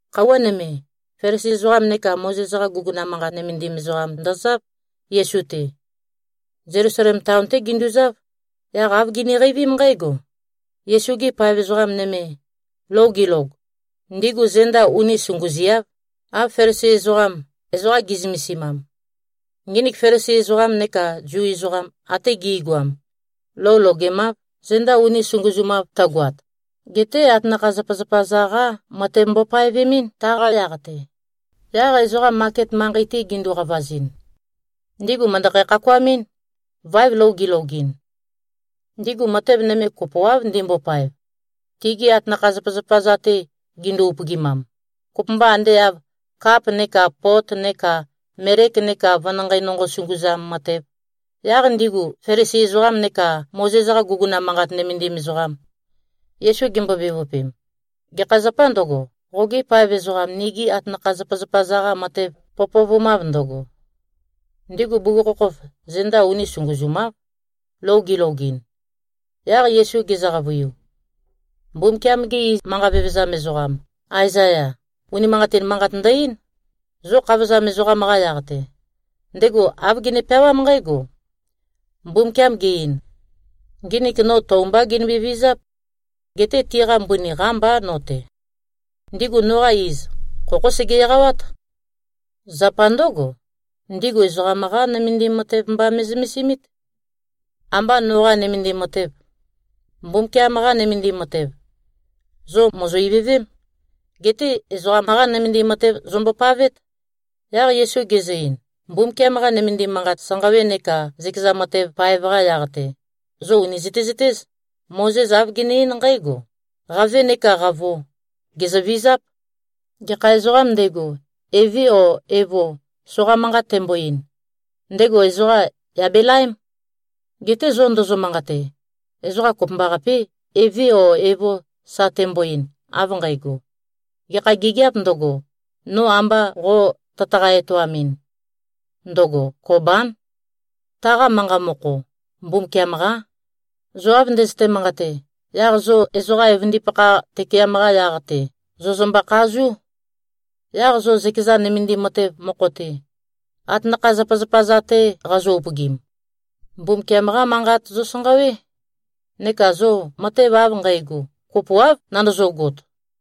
Khøuwa nøme, Felisi ezoqam neka Mozes-qa guguna manqat nømendim ezoqam ndozáv, Yesu-te. Zelusalem taon-té ginduzáv. Yaq āv giniqeivím nqǽgo: Yesu-gi paev ezoqa nøme, lou gilog, ndigu zenda uni sunguziáv, av Felisi ezoqam, ezoqa gi꞉zømesimam. (Nginik Felisi ezoqam neka Zu ezoqam ate gi꞉goam, lou logemáv, zenda uni sunguzumav tøgoat. Geté atanakha-zapazapa-za-qá matev mbopaevemɨ́n, taqa yaq-te. Yaq ezoqam maket manqei-te gindu-qavazɨn, ndigu mø̀ndøkhæ-khakuamɨ́n, váev lou gilogɨn. Ndigu matev nøme kopoáv ndimbopaev, tigi atanakha-zapazapa-za-te gindu-upøgimam, kopømba ande av kap neka pot neka melek neka venanqei nonqo sunguzam matev.) Yaq ndigu Felisi ezoqam neka Mozes-qa guguna manqat nømendim ezoqam, Yesu gimbo-bevøpem, “Gekha zapâ ndøgo, qogi paev ezoqam nigi atanakha-zapazapa-za-qa matev pøpøvumav ndøgo? Ndigu bugukhokhof zenda uni sunguzumáv, lou gilogɨn.” Yaq Yesu gezø-qavøiu, “Mbumbukiam-ge manqa vevezam ezoqam Aezaya, unimanqatin manqat ndø-eín, zo khavozam ezoqam-qa yaq-te. Ndego āv gene-peawám nqǽgo, ‘Mbumbukiam ge-ein: Nginik no tou mbá ginømbe-vizáp. Geté tiqa mbøni qámbá no-te. Ndigu noqa iz, khokhó sege-eqawát. Zapa ndǿgo, ndigu ezoqam-qá nømendim matev mba me꞉zømesimít. Ambá noqā nømendim matev.’ Mbumbukiam-qa nømendim matev, zo mòzo-ivøvém. Geté ezoqam-qá nømendim matev zombopavét.” Yaq Yesu gezø-ein, “Mbumbukiam-qa nømendim manqat sanqawe neka zøkeza matev paev-qa yaq-te, zo ùni zøtezøtéz. Mozes āv gene-eín nqǽgo, ‘Qave neká qavo, gèzøvizáp. Gekha ezoqām ndego, eve o evo soqa manqat tembo-ein, ndego ezoqa, yà belaém.’ Geté zo ndozo-manqate, ezoqa kopømbaqapé, eve o evo sa tembo-ein, av nqægo, gekha gigiāp ndøgo, no amba qo tøtaqa-etoamɨn, ndøgo Kobán. (Taqa manqa mokho, ‘Mbumbukiam-qá.’) Zo av ndøzøte-manqate, yaq zo ezoqa evøndipakha tøkeam-qa yaq-te, zòzømbø-khazú. Yaq zo zøkeza nømendim matev mokho-te, atanakha-zapazapa-za-te qazo-upøgim, Mbumbukiam-qá Manqat zosanqawé. Neka zo matev av nqægo, kopoáv nandozogot.”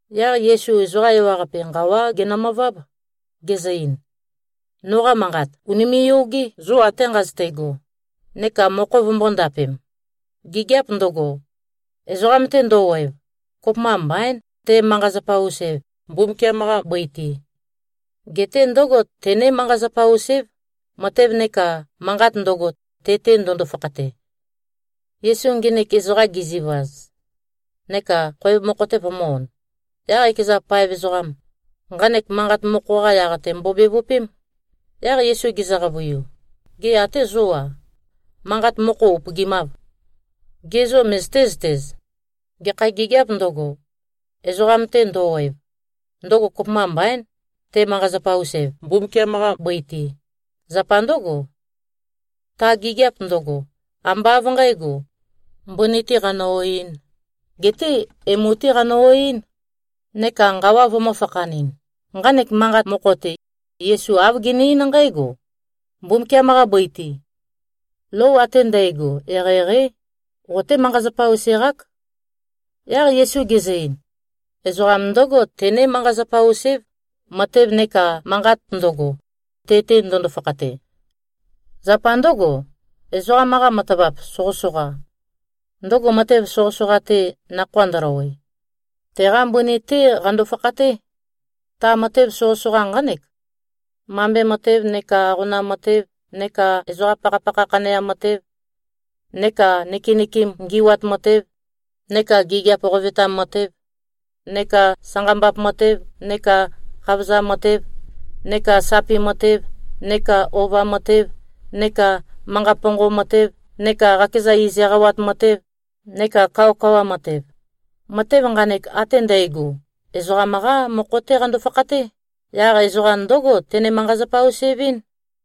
Yaq Yesu ezoqa ewaqape nqawá genømøváb, gezø-ein, “Noqa manqat ùnime꞉-yogé, zo ate nqazøte꞉go, neka mokho vømbō-ndapem! Gigiap ndøgo, ezoqam-te ndø-oev, kopømba mbaín, te꞉-manqa-zapa-us-ev, Mbumbukiam-qa bøi-te. Geté ndǿgo tené-manqa-zapa-us-év, matev neka manqat ndøgo, te-te ndøndo-fakhate.” Yesu nginik ezoqam gezivaz, neka khoev mokho-te vømø̄-on, yaq ekeza paev ezoqam, nqanek manqat mokho-qa yaq-te mbobevøpém. Yaq Yesu gezø-qavøiu, “Gê, até zó-a, manqa mokho upøgimâv? Ge zô, møzøté-zøtez? Gekha gigiāp ndøgo, ezoqam-te ndø-oev, ndøgo kopømba mbaín, te꞉-manqa-zapa-us-ev, Mbumbukiam-qa bøi-te. Zapa ndǿgo, ta gigiap ndøgo, ambá av nqǣgo, mbøni-tē qanø-oeɨ́n, geté emu-té qanø-oeɨ́n, neka nqawa vømø̄-fakhanɨn.” (Nqanek manqat mokho-te, Yesu āv gene-eín nqǽgo: Mbumbukiam-qa bøi-te, lou ate ndægo eqeieqeí. Qoté-manqa-zapa-us-eq-ák.) Yaq Yesu gezø-ein, “Ezoqam ndǿgo tené-manqa-zapa-us-év, matev neka manqat ndøgo, te-te ndøndo-fakhate. Zapa ndǿgo, ezoqam-qa matavap soqøsoqa, ndøgo matev soqøsoqa-te nakhoa ndøløwe, teqa mbøni-té qando-fakhaté. Ta matev soqøsoqa nqánek: Mambe matev, neka aqonam matev, neka ezoqa pakhapakha khaneam matev, neka nøkenøkem ngi꞉wat matev, neka gigiap qovetam matev, neka sanqambap matev, neka khavozam matev, neka sapi matev, neka ova matev, neka manqa ponqom matev, neka qakeza iz eqawat matev, neka kawakawa matev. Matev nqanek ate ndægo, ezoqam-qá mokho-té qando-fakhaté. Yaq ezoqa ndǿgo tene-manqa-zapa-us-evɨ́n.”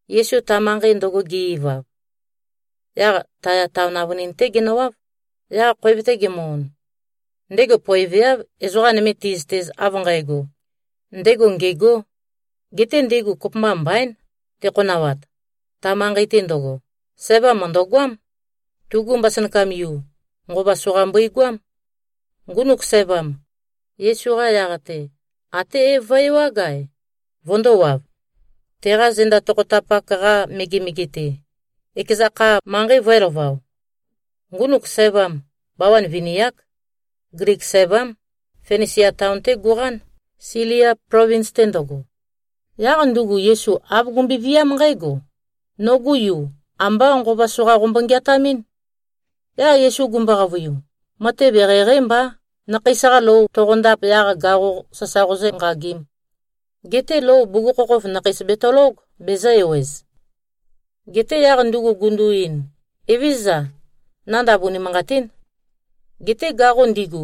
Yesu ta manqei ndøgo ge-ivav, yaq Taya taon avønin-té genøwáv. Yaq khoev-te gemø-on, ndego poeveáv ezoqa nøme ti꞉zøtez av nqægo, ndego ngêgō. Geté ndego kopømba mbaín tekhonawat. Ta manqei-te ndøgo, sævam mø̀ndøgoám. Tugu mbasønakam-yu, nqova soqa mbøigoám. Ngunuk sævam, Yesu-qa yaq-te até é-vøe-ewág-ae, vøndōwav, teqa zenda tokhotapak-qa megemege-te, ekeza kha, manqei vø̄elavao. Ngunuk sævam, bawan vini-ák. Glik sævám. Finisia taon-té guqán, Silia plovins-te ndøgo. Yaq ndugu Yesu āv gumbøe-viám nqǽgo, “Nogu yu, ambá nqova soqa qombo-ngeatamín?” Yaq Yesu gumbo-qavøiu, “Matev eqeieqeí mbá, nakheis-qa lou toqondap, yaq gaqo sasa qozǿnqagīm. Geté lou bugukhokhof nakheis betølóg, bezø̄-ewez.” Geté yaq ndugu gundu-ein, “Evézøza. Nandav unimanqatín. Geté gaqo ndigu,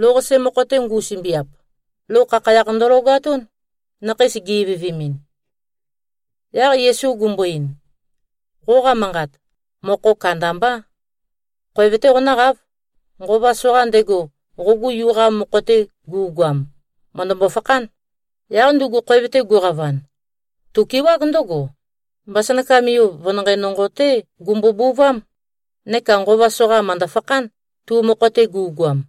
lou-qase mokho-te ngu꞉sømbiap, lou khakhayakh ndølogatún, nakheis gi-ivøvemin.” Yaq Yesu gumbo-ein, “Qoqa manqat, mokho kandambá. Khoev-té qonǿqáv. Nqova soqa ndego, qogu yu-qa mokho-te gu꞉goam, mø̀ndømbo-fakhán.” Yaq ndugu khoev-te guqavan, tukewág ndǿgo, mbasønakam-yu, venanqei nonqo-té gumbobuvám. Neka nqova soqa mø̀ndø-fakhán, tu mokho-te gu꞉goam.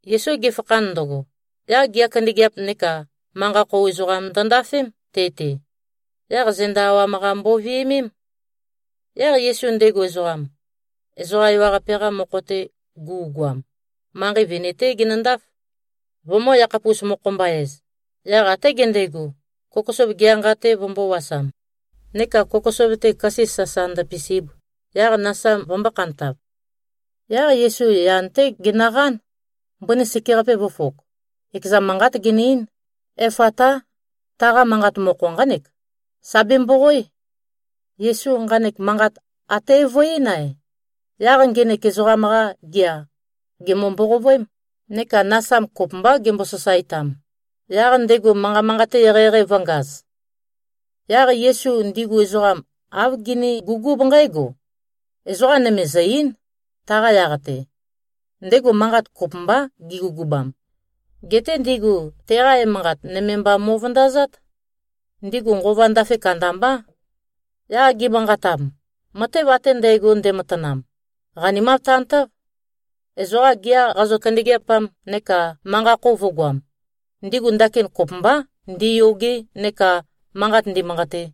Yesu gefakhan ndøgo, yaq gea kandøgeap neka manqa-khou ezoqam ndøndafém, te-te. Yaq zenda awam-qa mboviømém. Yaq Yesu ndego ezoqam, ezoqa ewaqape-qa mokho-te gu꞉goam, manqei vini-té genøndáf, vømø̄-yakhapus-mokho-mba-ez. Yaq até gendego, kokosov gea nqa-te vømbōwasam, neka kokosov-te køse sasa ndøpisib, yaq nasam vømbō-khantav. Yaq Yesu yan-té genøqán, mbøni sekeqape vø̄fok, ekeza manqat-te ge-ein, “Efatá!” Taqa manqa mokho nqánek, “Sà bemboqoé!” Yesu nqanek manqat até é-vø-eín-ae, yaq ngenek ezoqam-qa gea gèmbo-mboqovøém, neka nasam kopømbá gembo-sasaetam, yaq ndego manqa manqate eqeieqei vø̄ngaz. Yaq Yesu ndigu ezoqam āv genegugúb nqǽgo, “Ezoqa nøme zø̀-ei᷄n, taqa yaq-te.” Ndego manqat kopømbá gegugubam. Geté ndigu teqa emanqat, nøme mba mo꞉vøndazát. Ndigu nqova ndafe kandambá, yaq gimanqatam, “Matev ate ndægo ndematanam, qanimav tantáv. Ezoqa gea qazø-kandøgeapam neka manqa-khou vø̄goam, ndigu ndakin kopømbá ndiyoge neka manqat ndimanqate.”